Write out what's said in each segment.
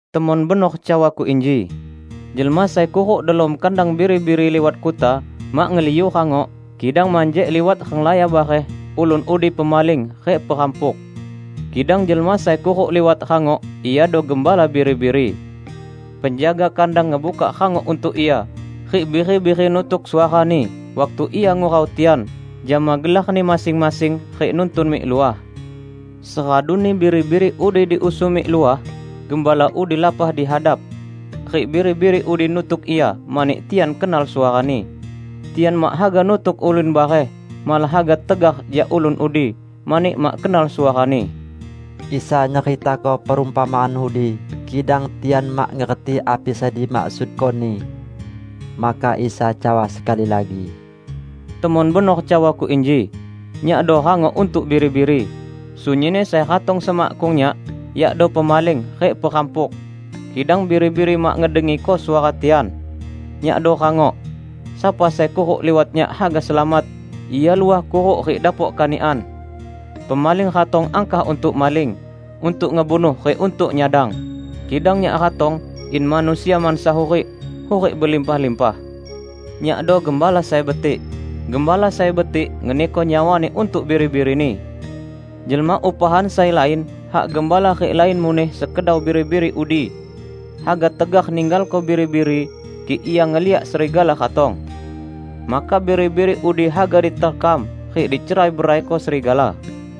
"Temon benor cawa-Ku inji: Jelma sai kuruk delom kandang biri-biri liwat kuta, mak ngeliu rangok, kidang manjek liwat renglaya bareh, ulun udi pemaling rik perampuk. Kidang jelma sai kuruk liwat rangok, iado gembala biri-biri. Penjaga kandang ngebukak rangok untuk ia, rik biri-biri nutuk suarani waktu ia ngurau tian jama gelarni masing-masing rik nuntun mik luah. Seraduni biri-biri udi diusung mik luah, gembala udi lapah di hadap, rik biri-biri udi nutuk ia mani tian kenal suarani. Tian mak haga nutuk ulun bareh, malah haga tegar jak ulun udi, mani mak kenal suarani." Isa nyeritako perumpamaan udi, kidang tian mak ngerti api sai dimaksudko-Ni. Maka Isa cawa sekali lagi, "Temon benor cawa-Ku inji: Nyakdo rangok untuk biri-biri. Sunyinni sai ratong semakkung Nyak yakdo pemaling rik perampuk, kidang biri-biri mak ngedengiko suara tian. Nyakdo rangok. Sapa sai kuruk liwat Nyak haga selamat; ia luah kuruk rik dapok kanikan. Pemaling ratong angkah untuk maling, untuk ngebunuh rik untuk nyadang. Kidang Nyak ratong in manusia mansa hurik -- hurik belimpah-limpah. Nyakdo gembala sai betik. Gembala sai betik ngeniko nyawani untuk biri-birini. Jelma upahan sai lain hak gembala rik lain muneh sekedau biri-biri udi, haga tegar ninggalko biri-biri kik ia ngeliak serigala ratong. Maka biri-biri udi haga diterkam rik dicerai-beraiko serigala.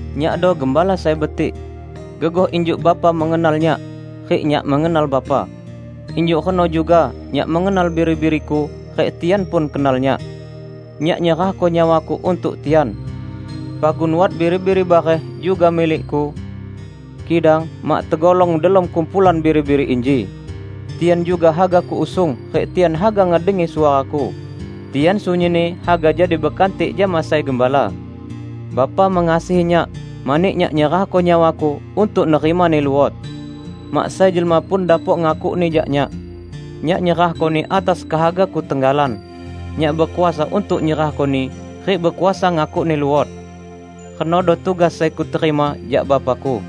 Nyakdo gembala sai betik. Gegoh injuk Bapa mengenal Nyak rik Nyak mengenal Bapa, injuk reno juga Nyak mengenal biri-biri-Ku rik tian pun kenal Nyak. Nyak nyerahko nyawa-Ku untuk tian. Pagun wat biri-biri bareh juga milik-Ku, kidang mak tegolong delom kumpulan biri-biri inji. Tian juga haga Kuusung rik tian haga ngedengi suara-Ku. Tian sunyinni haga jadi bekantik jama sai gembala. Bapa mengasihi Nyak mani Nyak nyerahko nyawa-Ku, untuk nerimani luot. Mak sai jelma pun dapok ngakukni jak Nyak. Nyak nyerahkoni atas kehaga-Ku tenggalan. Nyak bekuasa untuk nyerahkoni, rik bekuasa ngakukni luot. Renodo tugas sai Kuterima jak Bapa-Ku."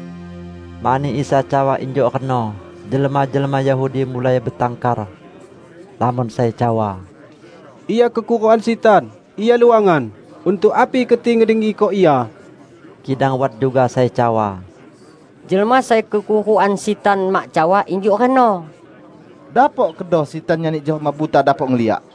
Mani Isa cawa injuk reno, jelma-jelma Yahudi mulai betangkar. Lamon sai cawa, "Ia kekurukan sitan! Ia luangan! Untuk api keti ngedengiko Ia?" Kidang wat juga sai cawa, "Jelma sai kekurukan sitan mak cawa injuk reno! Dapok kedo sitan nyani jelma buta dapok ngeliak?"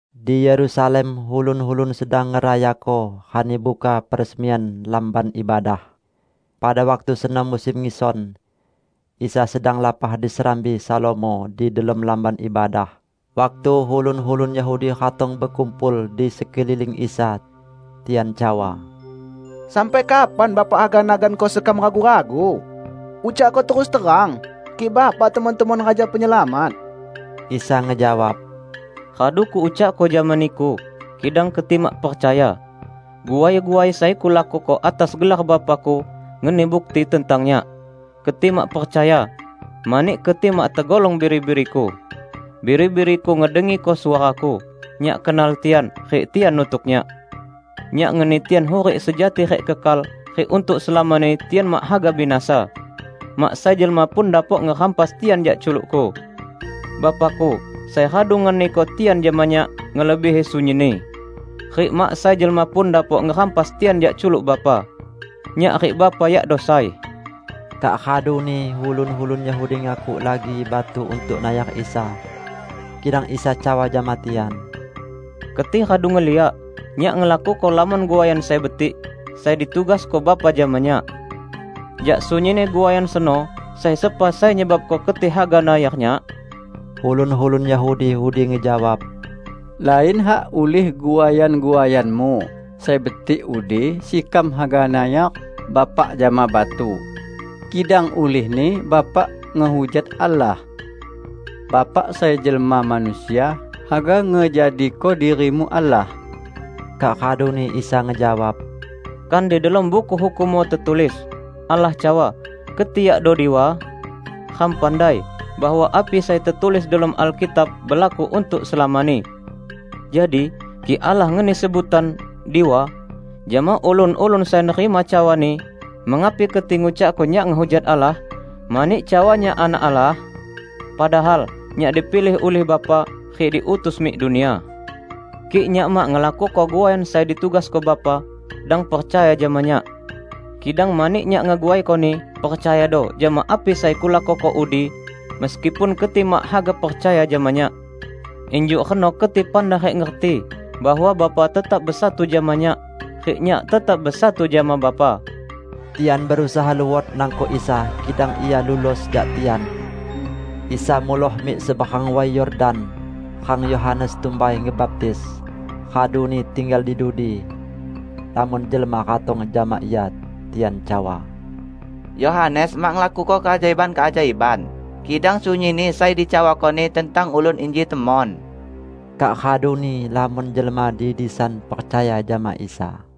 Di Yerusalem ulun-ulun sedang ngerayako Rani Buka Peresmian Lamban Ibadah. Pada waktu seno musim ngison. Isa sedang lapah di Serambi Salomo di delom Lamban Ibadah, waktu ulun-ulun Yahudi ratong bekumpul di sekeliling Isa. Tian cawa, "Sampai kapan Bapa haga naganko sekam ragu-ragu? Ucakko terus terang, kik Bapa temon-temon Raja Penyelamat." Isa ngejawab, "Radu Kuucakko jama niku, kidang keti mak percaya. Guai-guai sai Kulakuko atas gelar Bapa-Ku, ngeni bukti tentang Nyak. Keti mak percaya mani keti mak tegolong biri-biri-Ku. Biri-biri-Ku ngedengiko suara-Ku. Nyak kenal tian, rik tian nutuk Nyak. Nyak ngeni tian hurik sejati rik kekal, rik untuk selamani tian mak haga binasa. Mak sai jelma pun dapok ngerampas tian jak culuk-Ku. Bapa-Ku, sai radu ngeniko tian jama Nyak, ngelebihi sunyinni. Rik mak sai jelma pun dapok ngerampas tian jak culuk Bapa. Nyak rik Bapa yakdo sai." Kak raduni ulun-ulun Yahudi ngakuk lagi batu untuk nayar Isa. Kidang Isa cawa jama tian, "Keti radu ngeliak Nyak ngelakuko lamon guaian sai betik, sai ditugasko Bapa jama Nyak. Jak sunyinni guaian seno, sai sepa sai nyebabko keti haga nayar Nyak?" Ulun-ulun Yahudi udi ngejawab, "Lain hak ulih guaian-guaian-Mu sai betik udi sekam haga nayar Bapa jama batu, kidang ulihni Bapa ngehujat Allah. Bapa sai jelma manusia haga ngejadiko diri-Mu Allah." Kak raduni Isa ngejawab, "Kan di delom Buku Hukummu tetulis: Allah cawa, 'Keti yakdo diwa'? Ram pandai bahwa api sai tetulis delom Alkitab belaku untuk selamani. Jadi kik Allah ngeni sebutan 'diwa' jama ulun-ulun sai nerima cawa-Ni, mengapi keti ngucakko Nyak ngehujat Allah mani cawa Nyak Anak Allah? Padahal Nyak dipilih ulih Bapa rik diutus mik dunia. Kik Nyak mak ngelakuko guaian sai ditugasko Bapa, dang percaya jama Nyak. Kidang mani Nyak ngeguaikoni, percayado jama api sai Kulakuko udi, meskipun keti mak haga percaya jama Nyak. Injuk reno keti pandai rik ngerti bahwa Bapa tetap besatu jama Nyak, rik Nyak tetap besatu jama Bapa." Tian berusaha luot nangkok Isa, kidang Ia lulos jak tian. Isa muloh mik seberang Way Yordan, rang Yohanes tumbai ngebaptis, raduni tinggal di dudi. Lamon jelma ratong jama Ia. Tian cawa, "Yohanes mak ngelakuko keajaiban-keajaiban, kidang sunyinni sai dicawakoni tentang ulun inji temon." Kak raduni lamon jelma di disan percaya jama Isa.